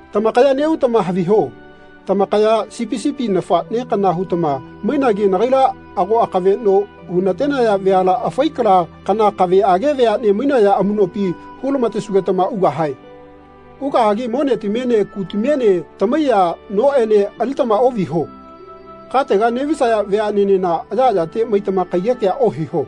Tamakaya neꞌutama haviho tamakaya sipi sipi nafaꞌne kana hutama mainagi nagaila ago amakaveꞌno hunenataya veala afai kala kana kaveꞌage veaꞌne mainaya amuꞌnopi hulamatesugetama ugahae. Ugahagi monetamiene kutamiene tamaiya noꞌene alitama oꞌviho. Katega neꞌvisaya veaꞌnenena ayaꞌayate maitama kaiyekea ohiho.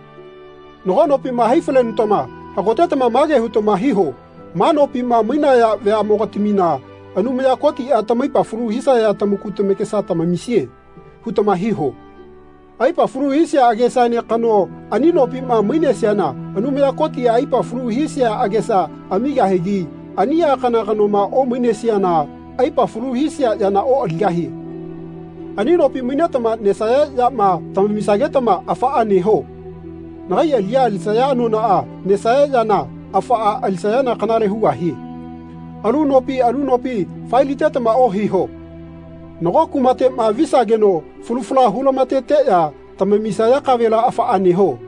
Nago nopima hai falenutama hagotetama mage hutama hiho ma nopima mainaya veaꞌmogatamina ‘Anumaya Kotiꞌa tamaipa falu hisaya tamaku tamakesa tamamisie.’ hutama hiho. Aipa falu hisia agesaene kano ani nopima mainesiana Anumaya Kotiꞌa aipa falu hisia agesa amigahigi aniꞌa kana kanoma omainesiana aipa falu hisia yana oꞌaligahie. Ani nopi mainetama nesaya yama tamamisagetama afaꞌa neho. Nagai aliꞌya alisaya anonaꞌa nesaya yana afaꞌa alisayana kanale hugahie. Alu nopi alu nopi faelitetama ohiho. Nago kumateꞌma visageno falu fala hulamateteꞌya tamamisaya kavela afaꞌa neho.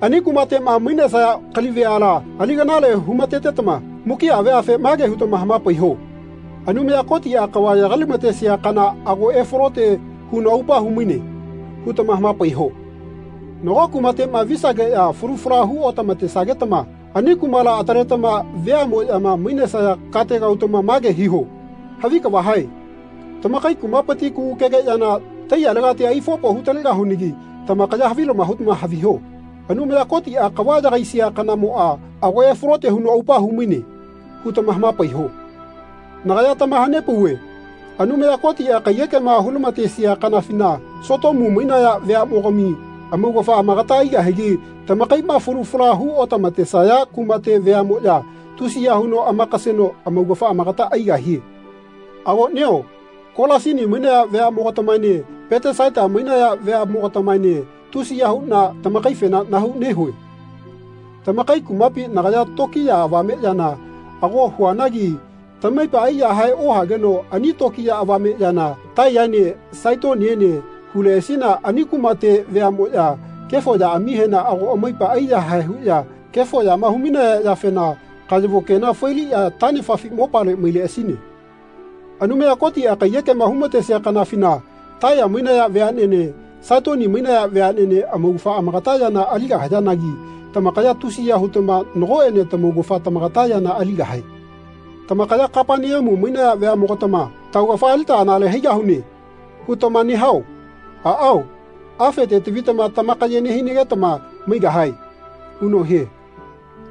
Ani kumateꞌma mainesaya kali veala ali kanale humatetama mukiꞌa veafe mage hutama hamapaiho ‘Anumaya Kotiꞌa kava yagailamatesia kana ago efalote huno aupa humaine.’ hutama hamapaiho. Nago kumateꞌma visageꞌya falu fala hu otamatesagetama ani kumala ataletama veaꞌmoꞌyama mainesaya katega utama mage hiho ‘Havi kava hae. Tamakai kumapiti kugukege yana taiyalegati aifopo hutalegahunagi tamakaya havilama hutama haviho Anumaya Kotiꞌa kava yagaisia kanamoꞌa ago efalote huno aupa humaine.’ hutama hamapaiho. Nagaya tamahanepauve Anumaya Kotiꞌa kaiyekema hulamatesia kanafina Sotomu mainaya veaꞌmogami amaugafa amagata aigahigi tamakaiꞌma falu fala hu otamatesaya kumate veaꞌmoꞌya tusiya huno amakaseno amaugafa amagata aigahie.” “Avoꞌnio Kolasini mainaya veaꞌmogatamaene Petesaita mainaya veaꞌmogatamaene tusiya huꞌna tamakaifena nahau nehue. Tamakai kumapi nagaya tokiya avameꞌyana ago huanagi tamaipa aiyahae ohageno ani tokiya avameꞌyana Taiyaene Saitoniene huleꞌasine ani kumate veaꞌmoꞌya kefo yaꞌamihena ago amaipa aiyahae huꞌya kefo yama humainaya yafena kayavo kena failiꞌya taꞌnefafi mopale maileꞌasine. Anumaya Kotiꞌa kaiyekema humatesia kanafina Taiya mainaya veaꞌnene Saitoni mainaya veaꞌnene amaugafa amagata yana aligahayanagi tamakaya tusiya hutama nagoꞌene tamaugafa tamagata yana aligahae. Tamakaya Kapaneamu mainaya veaꞌmogatama ‘Taugafa alita anale haigahune.’ hutama nehao? Aꞌao afete tavitama tamakaye nehinagetama maigahae.” huno hie.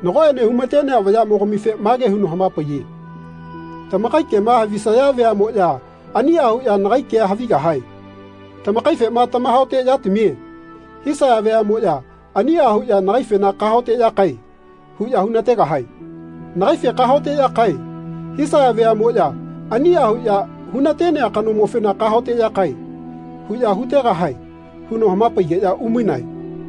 Nagoꞌene humatenea vayaꞌmogamife mage huno hamapaiye “Tamakai kema havisaya veaꞌmoꞌya aniꞌa huꞌya nagai kea havigahae. Tamakaifema ‘Tamahaoteꞌyatamie.’ hisaya veaꞌmoꞌya aniꞌa huꞌya nagaifena ‘Kahaoteꞌyakae.’ huꞌya hunategahae. Nagaife ‘Kahaoteꞌyakae.’ hisaya veaꞌmoꞌya aniꞌa huꞌya hunatenea kanomofena ‘Kahaoteꞌyakae.’ huꞌya hutegahae huno hamapaigeꞌya umainae.”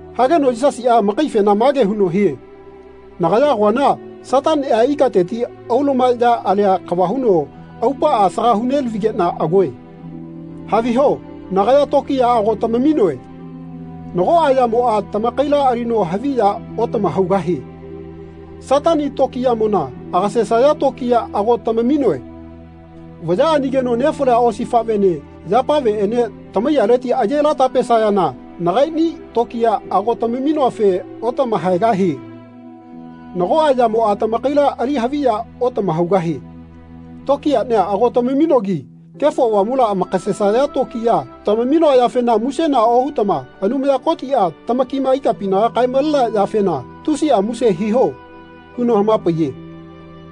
Hageno Yisasiꞌa amakaifena mage huno hie “Nagaya agoana Sataniꞌa ikateti aulumaya alia kava huno aupaꞌa asaga hunelavigeꞌna agoe. Haviho nagaya tokiya ago tamaminoe. Nagoꞌa yamoꞌa tamakaila alino haviya otamahaugahie. Satani tokiyamona agasesaya tokiya ago tamaminoe. Vaya anigeno nefalia osifaꞌvene yapaveꞌene tamaiyaleti ayelatapesayana nagaiꞌni tokiya ago tamaminoafe otamahaegahie. Nagoꞌa yamoꞌa tamakaila ali haviya otamahaugahie. Tokiyaꞌnia ago tamaminogi Kefo Avamula amakasesaya tokiya tamaminoa yafena musena ohutama Anumaya Kotiꞌa tamakima ikapinaga kaemalenea yafena tusiꞌa muse hiho.” huno hamapaiye.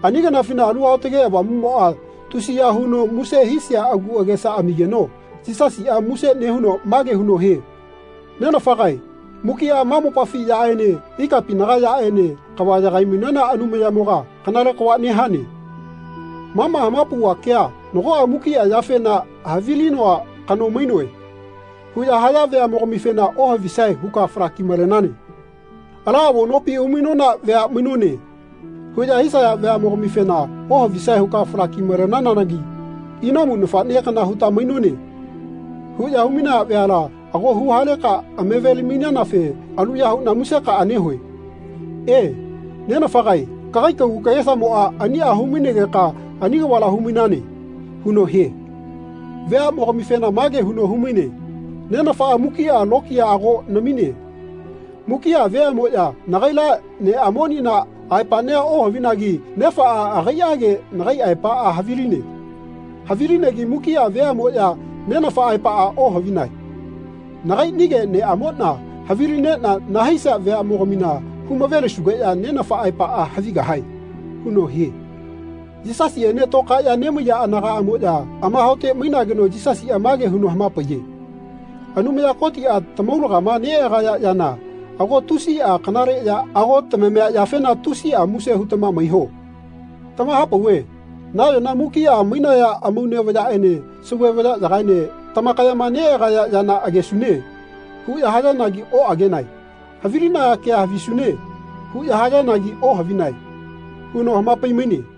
Ani kanafina Alu Aotage Avamuꞌmoꞌa tusiya huno muse hisia agu agesa amigeno Yisasiꞌa muse nehuno mage huno hie “Nenafagae mukiꞌa ma mopafi yaꞌene ikapinaga yaꞌene kava yagaimainana Anumayamoga kanale kava nehane. Ma ma hamapauva kea nagoꞌa ‘Mukiꞌa yafena havilinoa kano mainoe.’ huꞌya haya veaꞌmogamifena ohavisae huka falakimalenane. ‘Ala avo nopi umainona vea mainone.’ huꞌya hisaya veaꞌmogamifena ohavisae huka falakimalenanagi ‘Inamu nafaꞌne kana huta mainone.’ huꞌya humainaya veala ago huhaleka amavelimainanafe aluya huꞌna musekaꞌa nehue. E, Nenafagae kagai kagu kagesamoꞌa aniꞌa humainegeka ani kavala humainane.” huno hie. Veaꞌmogamifena mage huno humaine “Nenafaꞌa mukiꞌa lokiya ago namine. Mukiꞌa veaꞌmoꞌya nagaila neꞌamonina aepaꞌnia ohavinagi Nenafaꞌa agaiꞌage nagai aepaꞌa haviline. Havilinegi mukiꞌa veaꞌmoꞌya Nenafa aepaꞌa ohavinae. Nagaiꞌnige neꞌamoꞌna havilineꞌna nahaisia veaꞌmogamina humavelisugeꞌya Nenafa aepaꞌa havigahae.” huno hie. Yisasiꞌene toꞌkaeꞌya nemaiya anagaꞌmoꞌya amahaote mainageno Yisasiꞌa mage huno hamapaiye “Anumaya Kotiꞌa tamaulagama neꞌagaya yana ago tusiꞌa kanale ya ago tamamia yafena tusiꞌa muse hutama maiho. Tamahapauve nayona mukiꞌa mainaya amaune vayaꞌene sauve vayaꞌyagaene tamakayama neꞌagaya yana ‘Agesune.’ huꞌya hayanagi oꞌagenae. Havilinaya kea ‘Havisune.’ huꞌya hayanagi ohavinae.” huno hamapaimaine.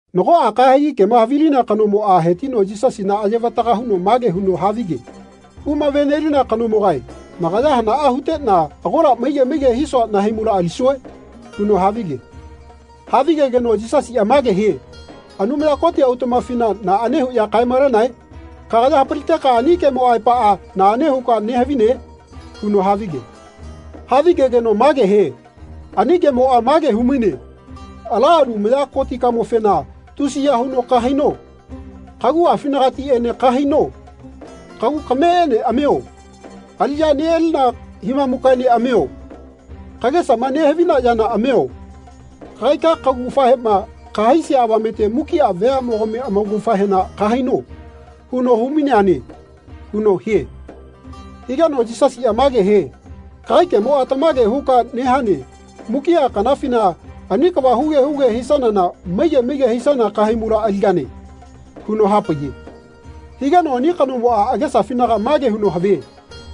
Nagoꞌa kahegi kema havilinea kanomoꞌa hetino Yisasina ayevataga huno mage huno havige “Humavenelina kanomogae nagaya hanaꞌa huteꞌna agola maige maige hisua nahaimula alisue?” huno havige. Havigegeno Yisasiꞌa mage hie “Anumaya Koti autaꞌmafina naꞌane huꞌya kaemalenae? Kagaya hapaliteka ani kemo aepaꞌa naꞌane huka nehavine?” huno havige. Havigegeno mage hie “Ani kemoꞌa mage humaine ‘Ala Anumaya Kotikamofena tusiya huno kahaino. Kaguꞌafinagatiꞌene kahaino. Kagu kameꞌene amio. Aliꞌya neꞌalina himamukaene amio. Kagesama nehavina yana amio. Kagaika kaugafahema kahaisia avamete mukiꞌa veamogami amaugafahena kahaino.’ huno humaineane.” huno hie. Higeno Yisasiꞌa mage hie “Kagai kemoꞌa tamage huka nehane mukiꞌa kanafina ani kava huge huge hisanana maige maige hisana kahaimula aligane.” huno hapaiye. Higeno ani kanomoꞌa agesafinaga mage huno havie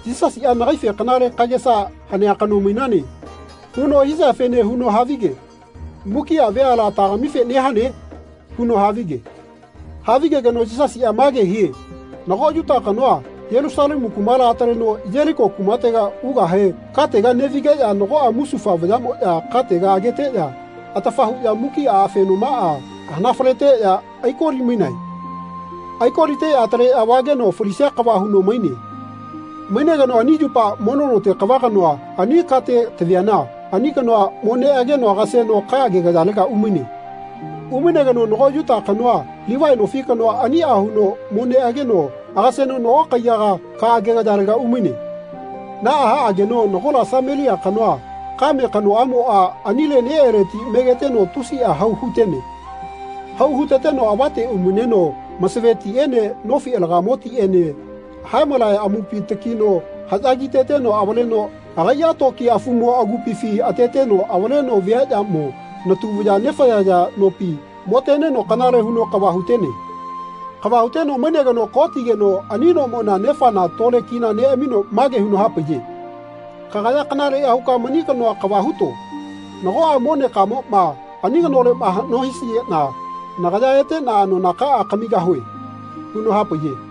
“Yisasiꞌa nagaife kanale kagesa hanea kano mainane.” huno hisiafene huno havige “Mukiꞌa veala tagamife nehane?” huno havige. Havigegeno Yisasiꞌa mage hie “Nago Yuta kanoa Yelusalemu kumala ataleno Yeliko kumatega ugahe katega neꞌvigeꞌya nagoꞌa musufa vayaꞌmoꞌya katega ageteꞌya atafa huꞌya mukiꞌa afenomaꞌa hanafaleteꞌya aikolimainae. Aikoliteꞌya ataleꞌya vageno falisia kava huno maine. Mainegeno ani yupa mono note kava kanoa ani kate taviana ani kanoa mo neꞌageno agaseno ka agegayalega umaine. Umainegeno nago Yuta kanoa Livai nofi kanoa aniꞌa huno mo neꞌageno agaseno nago kaiyaga ka agegayalega umaine. Naꞌa haꞌageno nagola Samelia kanoa kame kanoꞌamoꞌa anile neꞌeleti megeteno tusiꞌa hau hutene. Hau huteteno avate umaineno masave tiꞌene nofi alagamo tiꞌene haemalaya amupina takino haꞌya kiteteno avaleno agaiꞌa toki afumo agupifi ateteno avaleno viaꞌyamo natu vaya nefayaya nopi moteneno kanale huno kava hutene. Kava huteno mainegeno ko tigeno ani nomona nefana tole kina neꞌamino mage huno hapaiye ‘Kagaya kanaleꞌya huka mani kanoa kava huto. Nagoꞌa monekamoꞌma ani kanoleꞌma haꞌno hisigeꞌna nagaya eteꞌna anonakaꞌa kamigahue.’ huno hapaiye.”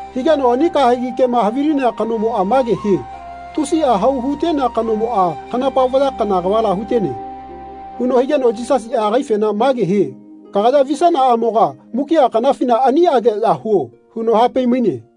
Higeno ani kahegi kema havilinea kanomoꞌa mage hie “Tusiꞌa hau hutenea kanomoꞌa kanapa vaya kana kavala hutene.” huno higeno Yisasiꞌa agaifena mage hie “Kagaya visanaꞌamoga mukiꞌa kanafina aniꞌageꞌya huo.” huno hapai-maine.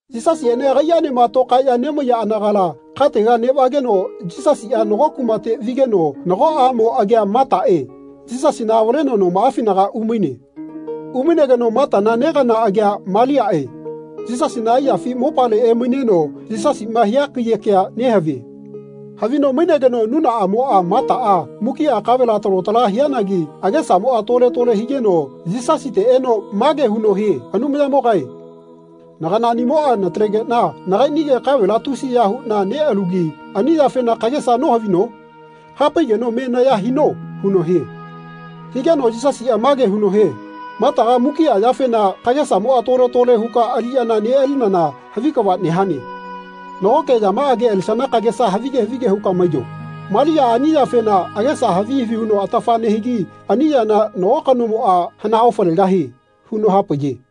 Yisasiꞌene agaiꞌaenema tokaeꞌya nemaiya anagala katega neꞌvageno Yisasiꞌa nago kumate vigeno nago aꞌmo agia Mataꞌe Yisasina avaleno nomaꞌafinaga umaine. Umainegeno Matana negana agia Maliaꞌe Yisasina aiyafi mopale emaineno Yisasiꞌma hia kaiyekea nehavie. Havino mainegeno nunaꞌamoꞌa, Mataꞌa, mukiꞌa kavela talo tala hiana agesamoꞌa tole-lole higeno Yisasite eno mage huno hie “Anumayamogae naganaꞌnimoꞌa natalegeꞌna nakaiꞌnige kavela tusiya huꞌna neꞌalugi ani yafena kagesa nohavino? Hapaigeno me naya hino.” huno hie. Higeno Yisasiꞌa mage huno hie “Mataga mukiꞌa yafena kagesamoꞌa tole-lole huka aliꞌyana neꞌalinana havi kava nehane. Nagoke yamaꞌage alisana kagesa havige havige huka maiyo. Maliaꞌa ani yafena agesa havi havi huno atafa nehigi ani yana nago kanomoꞌa hana-ofalegahie.” huno hapaiye.